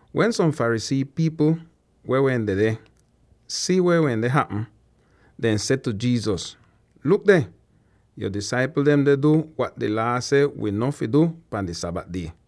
Wen som Pharisee pipl weh wehn dedeh si weh wende hapm, dehn seh tu Jesus, “Luk deh! Yo disaipl dem deh du wat di Laa seh wi no fi du pan di Sabat die!”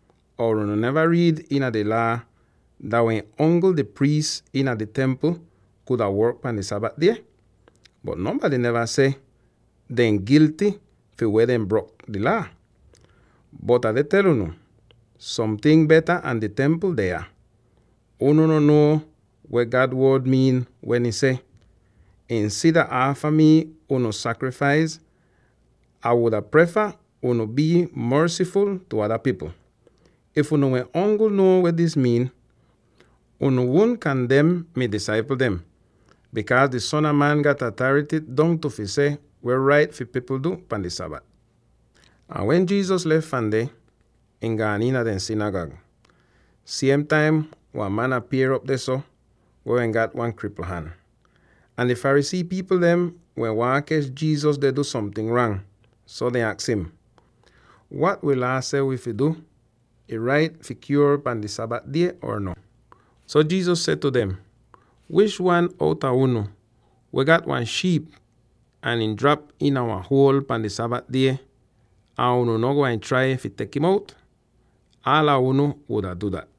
Or unu neva riid iina di Laa dah wehn ongl di priis iina di Templ kuda work pahn di Sabat die? Bot nonbady neva seh dehn gilty fi weh dehn brok di Laa. Bot Ah deh tel unu, somting beta an di Templ deh yah! Unu no nuo weh God Wod miin weh ih seh, ‘Insida aafa mii unu sakrifais, Ah wuda prefa unu bii mersiful tu ada pipl.’ If unu wehn ongl nuo weh dis miin, unu wudn kandem mi disaipl dem. Bikaaz, di Son a Man gat atarity dongtu fi seh weh rait fi pipl du pan di Sabat.” Ahn wen Jesus lef fahn deh, ihn gaan iina dehn sinigag. Siem taim wan man apier'op dehso, weh wehn gat wan kripl han. Ahn di Pharisee pipl dehn wehn waahn kech Jesus deh du somting rang, so dehn aks im, “Wat wi Laa seh wi fi du; ih rait fi kyuor pan di Sabat die or no?” So Jesus seh tu dem, “Wish wan outa unu, weh gat wan shiip ahn ihn drap iina wan huol pahn di Sabat die, ahn unu no gwain trai fi tek im out? Aala unu wuda du dat.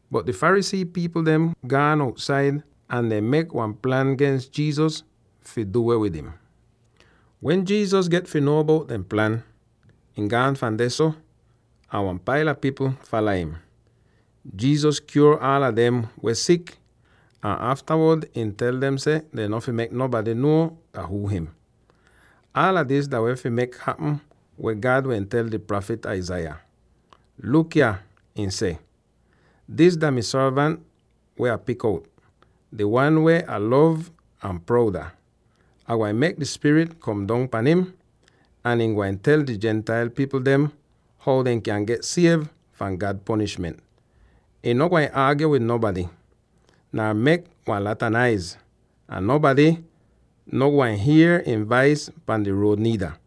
Bot di Pharisee pipl dem gaan outsaid, ahn dehn mek wan plan gens Jesus fi du weh wid im. Wen Jesus get fi nuo bout dehn plan, ihn gaan fahn dehso, ahn wan paila pipl fala im. Jesus kyuor aala dem weh sik, ahn aftawod ihn tel dem seh dehn no fi mek nonbady nuo dah huu him. Aala dis dah wehn fi mek hapm weh God wehn tel di prafit Isaiah, wen ihn seh: “Luk yah, dis dah mi sorvant weh Ah pik out, di wan weh Ah lov ahn proud ah! Ah gwain mek mi spirit kom dong pahn im, ahn ihn gwain tel di Gentile pipl dem how dehn kyan get siev fahn God ponishment. Ihn no gwain aagyo wid nonbady, nar mek wan lata naiz, ahn nonbady no gwain hier ihn vais pahn di ruod niida.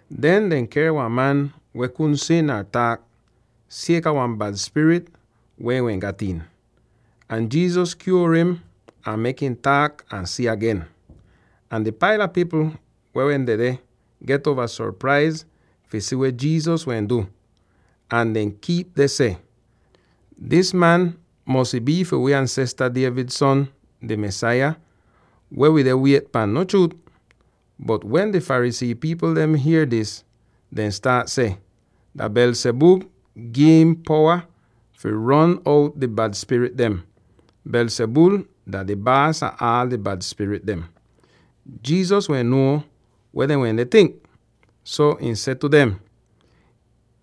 Den dehn ker wan man weh kudn si nar taak, sieka wan bad spirit weh ihn wehn gat iin. Ahn Jesus kyuor im ahn mek ihn taak ahn si agen! Ahn di paila pipl weh dedeh get uova sopraiz fi si weh Jesus wehn du, ahn dehn kiip deh seh, “Dis man mosy bii fi wi ansesta David son; di Mesaya weh wii deh wiet pahn, no chruut?” Bot wen di Pharisee pipl dem hier dis, dehn staat seh, “Dah Beelzebul gi'im powa fi ron out di bad spirit dem. Beelzebul dah di baas ah aal di bad spirit dem.” Jesus wen nuo weh dehn wende tink, so ihn seh tu dem,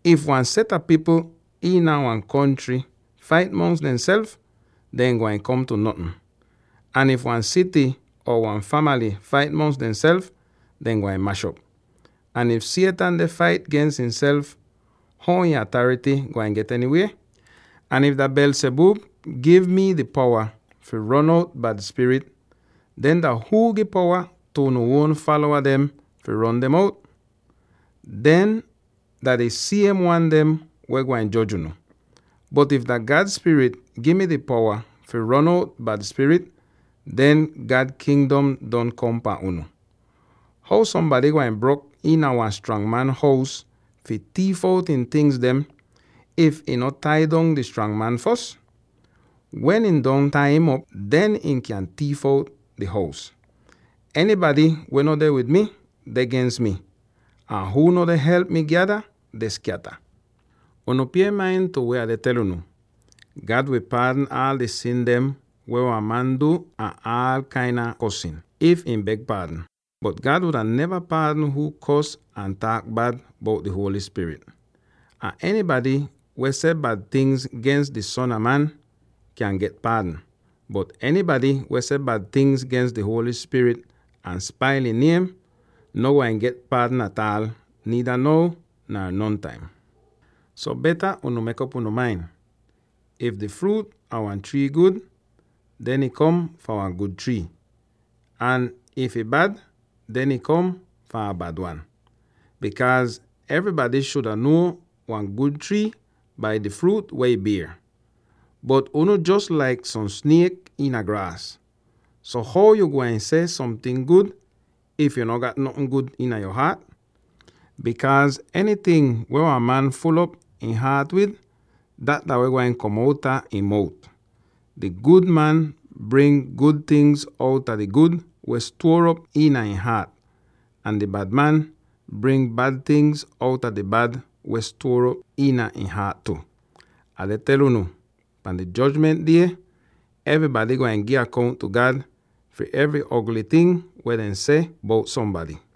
“If wan set a pipl iina wan kontry fait mongs demself, dehn gwain kom tu notn. Ahn if wan sity or wan famaly fait mongs demself, dehn gwain mash'op. Ahn if Satan deh fait gens ihnself, how ihn atarity gwain get enywie? Ahn if dah Beelzebul gi mi di powa fi ron out bad spirit, den dah huu gi powa tu unu uon falowa dem fi ron dem out? Dehn dah di siem wan dem weh gwain joj unu. Bot if dah God Spirit gi mi di powa fi ron out bad spirit, den God Kingdom don kom pan unu. “How sombady gwain brok iina wan strang man hous fi tiif out ihn tingz, if ihn no tai dong di strang man fos? Wen ihn don tai'im op, den ihn kyan tiif out di hous. “Enybady weh no deh wid mi, deh gens mi; ahn huu no deh help mi gyada, deh skyata. “Unu pie main tu weh Ah deh tel unu: God wi paadn aal di sin dem weh wan man du ahn aal kain a kosn, if ihn beg paadn. Bot God wuda neva paadn huu kors or taak bad bout di Holy Spirit. Ahn enybady weh seh bad tingz gens di Son a Man kyan get paadn, bot enybady weh seh bad tingz gens di Holy Spirit ahn spail ihn niem, no gwain get paadn ataal, niida now nar nontaim. “So, beta mek'op unu main: if di fruut a wan trii gud, den ih kom fahn wan gud trii, ahn if ih bad, den ih kom fahn a bad wan. Bikaaz evrybady shuda nuo wan gud trii bai di fruut weh ih bier. Bot unu jos laik som sniek iina graas! So how yo gwain seh somting gud, if yo no gat notn gud iina yo haat? Bikaaz enyting weh wan man ful'op ihn haat wid, dat dah weh gwain kom outa ihn mout! Di gud man bring gud tingz outa di gud weh stuor op iina ihn haat, ahn di bad man bring bad tingz outa di bad weh stuor op iina ihn haat tu. “Ah deh tel unu: pahn di Jojment Die evrybady gwain gi akount tu God fi evry ogly ting weh dehn seh bout sombady.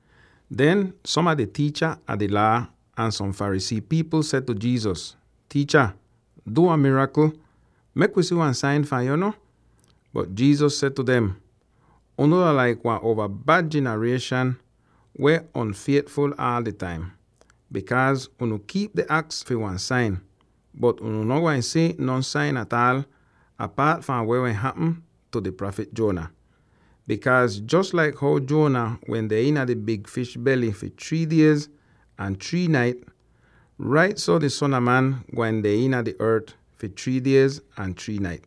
Den som a di tiicha a di Laa ahn som Pharisee pipl seh tu Jesus, “Tiicha, du wan mirakl; mek wi si wan sain fahn yo no.” Bot Jesus seh tu dem, “Unu dah laik wan uova bad jinarieshan weh on'fietful aal di taim, bikaaz unu kiip deh aks fi wan sain, bot unu no gwain si non sain ataal apaat fahn weh wehn hapm tu di prafit Jonah. Bikaaz jos laik how Jonah wende iina di big fish bely fi three diez ahn three nait, rait so di Son a Man gwain deh iina di ort fi three diez ahn three nait.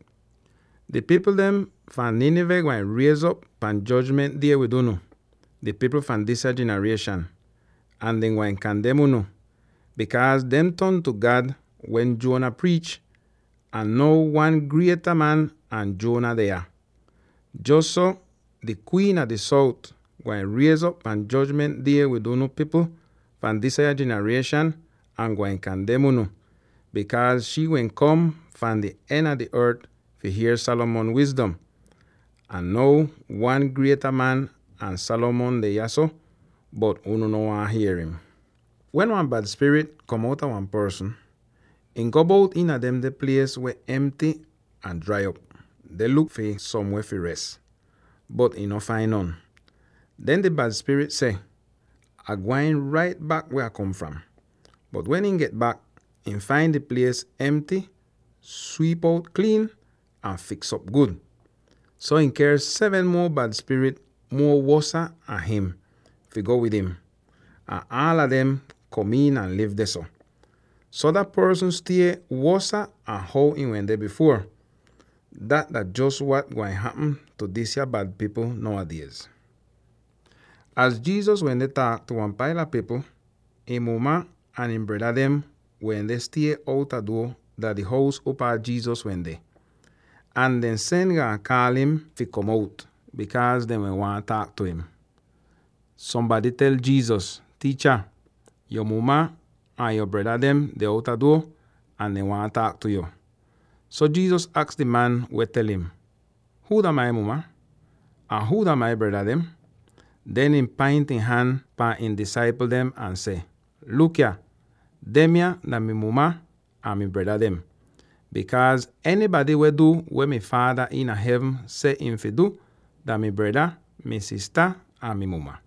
Di pipl dem fahn Nineveh gwain riez'op pan Jojment Die wid unu —di pipl fahn disya jinarieshan— ahn dah dem gwain kandem unu, bikaaz dehn ton tu God wen Jonah priich, ahn now wan grieta man an Jonah deh yah! Jos so, di Kwiin a di Sout gwain riez'op pan Jojment Die wid unu pipl fahn disya jinarieshan ahn gwain kandem unu, bikaaz shii wehn kom fahn di en a di ort fi hier Solomon wizdom. Ahn now wan grieta man an Solomon deh yahso, bot unu no waahn hier im! “Wen wan bad spirit kom outa wan porsn, ihn go bout iina demde plies weh emty ahn drai op, deh luk fi somweh fi res, bot ihn no fain non. Den di bad spirit seh, ‘Ah gwain rait bak weh Ah kom fram,’ bot wen ihn get bak, ihn fain di plies emty, swiip out kliin, ahn fiks'op gud. So ihn ker seven muo bad spirit muo wosa an him, fi go wid im. Ahn aala dem kom iin ahn liv dehso. So dah porsn stie wosa an how ihn wende bifuor. Dat dah jos wat gwain hapm tu disya bad pipl now a diez!” Az Jesus wende taak tu wan paila pipl, ihn muma ahn ihn breda dem wende stie outa duo dah di hous upaa Jesus wende. Ahn dehn sen gaan kaal im fi kom out, bikaaz dehn wehn waahn taak tu im. So sombady tel Jesus, “Tiicha, yo muma ahn yo breda dem deh outa duo, ahn dehn waahn taak tu yo.” So Jesus aks di man weh tel im, “Huu dah mai muma? Ahn huu dah mai breda dem?” Den ihn paint ihn han pahn ihn disaipl dem ahn seh, “Luk yah! Demya dah mi muma ahn mi breda dem! Bikaaz enybady weh du weh mi Faada iina hevn seh ihn fi du, dah mi breda, mi sista ahn mi muma.”